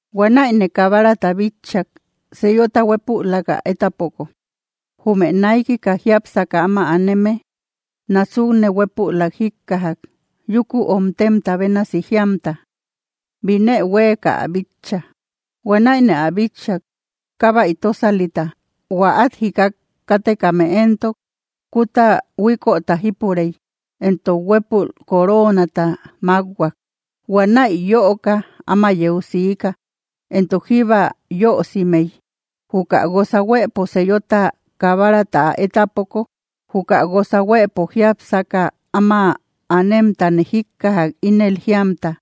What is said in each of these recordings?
Huanäine Kabarata bitchak, sellota huépülak ä étapoko. Jume naikika jiápsaka áma aneme násukne huépülak jíkkajak, yúku omtemta bénasi jíamta: —¡Binë huéeka ä bitcha! Huanäine ä bitchak, kábay tósalita. Huä át jikat kátekame éntok, kúta huíköta jípurey; entok huépü coroonata mákhuak. Huanäi yöoka áma yeu siika, entok jíba yösimey. Juka guosa huëpo sellota Kabarata ä étápoko, juka guosa huëpo jiápsaka áma anemtane jíkkajak, ínel jíamta: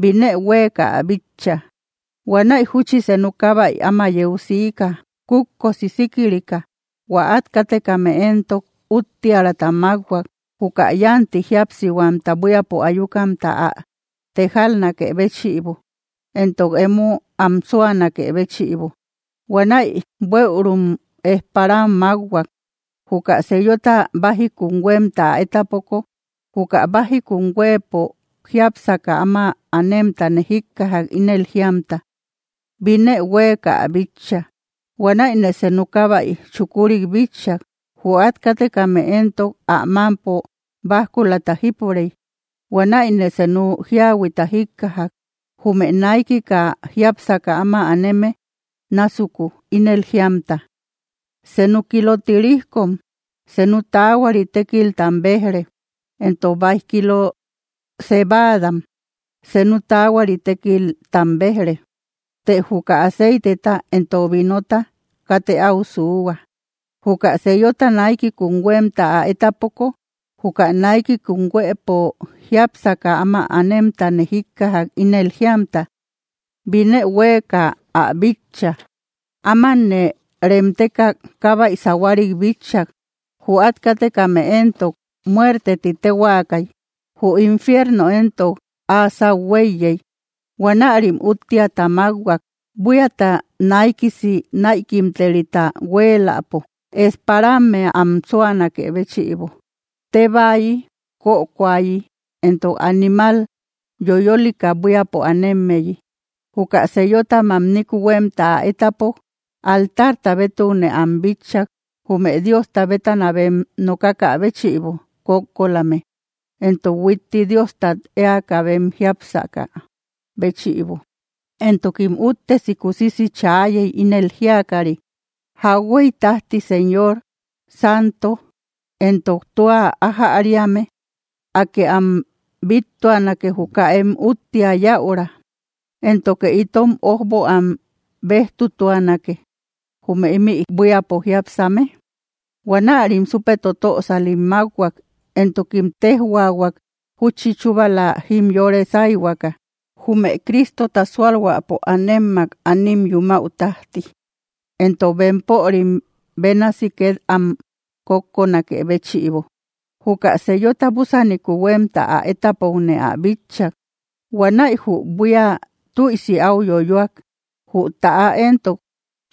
—¡Binë huéeka ä bitcha! Huanäi júchi senu kábay áma yeu siika, kutkosi síkirika. Huä át kátekame éntok, úttiärata mákhuak, juka yánti jíapsihuamta buíapo ayukamta ä tejalnakë béchïbo, entok emo am súanakë béchïbo. Huanäi bueürum ejparam mákhuak. Juka sellota bájikum huémta ä étapoko, juka bájikum huëpo jiápsaka áma anemtane jíkkajak, ínel jíamta: —¡Binë huéeka ä bitcha! Huanäine senu kábay chukurik bitchak. Jü át kátekame éntok, ä mámpo bajkulata jípurey. Huanäine senu jíahuita jíkkajak, jume naikika jiápsaka áma aneme násuku, ínel jíamta: —¡Senu kilo tirijkom, senu taahuari tékiltam béj‑re! Éntok, ¡báij kilo cebaadam, senu taahuari tékiltam béj‑re! Të juka aceiteta entok vinota, ¡katë áu suuhua! Juka sellota naikikum huémta ä étapoko, juka naikikum huëpo jiápsaka áma anemtane jíkkajak, ínel jíamta: —¡Binë huéeka ä bitcha! Ámanne remteka kábay sahuarik bitchak. Jü át kátekame éntok, muerte ti téhuaakay. Jü infierno éntok, áa sáu huéiyey. Huanärim úttiata mákhuak, buíata naikisi näikimterita huéeläpo, ejparammea am súanakë béchïbo, tébaayi, kökoayi, entok animal yoyolika buíapo anemmeyi. Juka sellota mamniku huémta ä étapok, altarta bétukne am bitchak, jume Diosta bétana bem nokakä béchïbo kókkolame, entok huitti Diostat éaka bem jiápsakä béchïbo. Entokim úttesi kusisi chaayey, ínel jíakari: —¿Jauhuey tájti, Señor, santo entok tua ájäriame, Akë am bíttuanake, juka em úttia yäura, éntoke itom ójbo am béjtutuanake, jume ímï buíapo jiápsame? Huanärim súpe totösalim mákhuak, entokim téjhuaahuak, júchi chúbala jimyore sáyhuaka, jume Cristota súalhuäpo ámemak anim yumäu tájti, entok bempörim bénasi két am kókkonakë béchïbo. Juka sellota búsaniku huémta ä étapokne ä bitchak. Huanäi jü buía tüisi áu yoyöak. Jü täa éntok,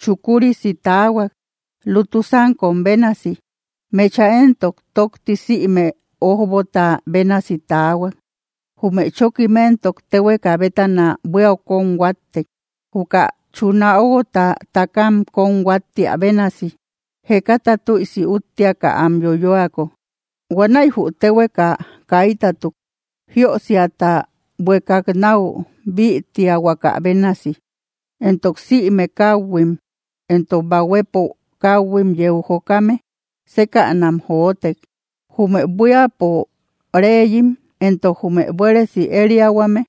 chukurisi taahuak, lutu sánkom bénasi. Mecha éntok tókti sïme ójbota bénasi taahuak. Jume chókim éntok, téhueka bétana buíau kón huáttek, juka chuna óguota takam kón huáttia bénasi, jekata tüisi úttiaka am yoyoako. Huanäi jü téhueka kaitatuk, jiösiata buekak náu bïtiahuaka bénasi. Entok sïme káuhuim, entok bahuepo káhuim yeu jokame, sékänam jotek. Jume buíapo reyim, entok jume buéresi ériahuame,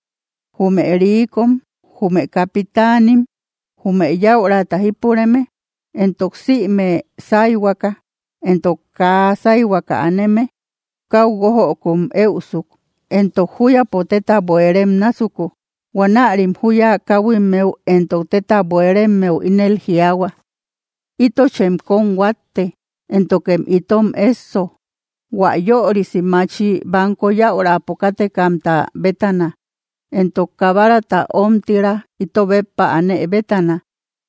jume riikom, jume capitanim, jume yäurata jípureme, entok sïme sáyhuaka, entok kaa sáyhuaka aneme, káu guójökum éusuk, entok júyapo téta buérem násuku. Huanärim juya káhuimmeu entok téta buéremmeu ínel jiaahua: —¡Ítochem kón huátte, éntokem itom ésso, hua yörisi machi banko yäurapo kátekamta bétana, entok Kabarata ómtira ito béppa anë bétana!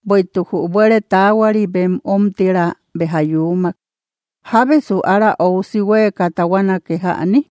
Bueïtuk jü buére taahuari bem ómtira béja yuumak. ¿Jábesu ára óusi huéeka taahuanake jäni?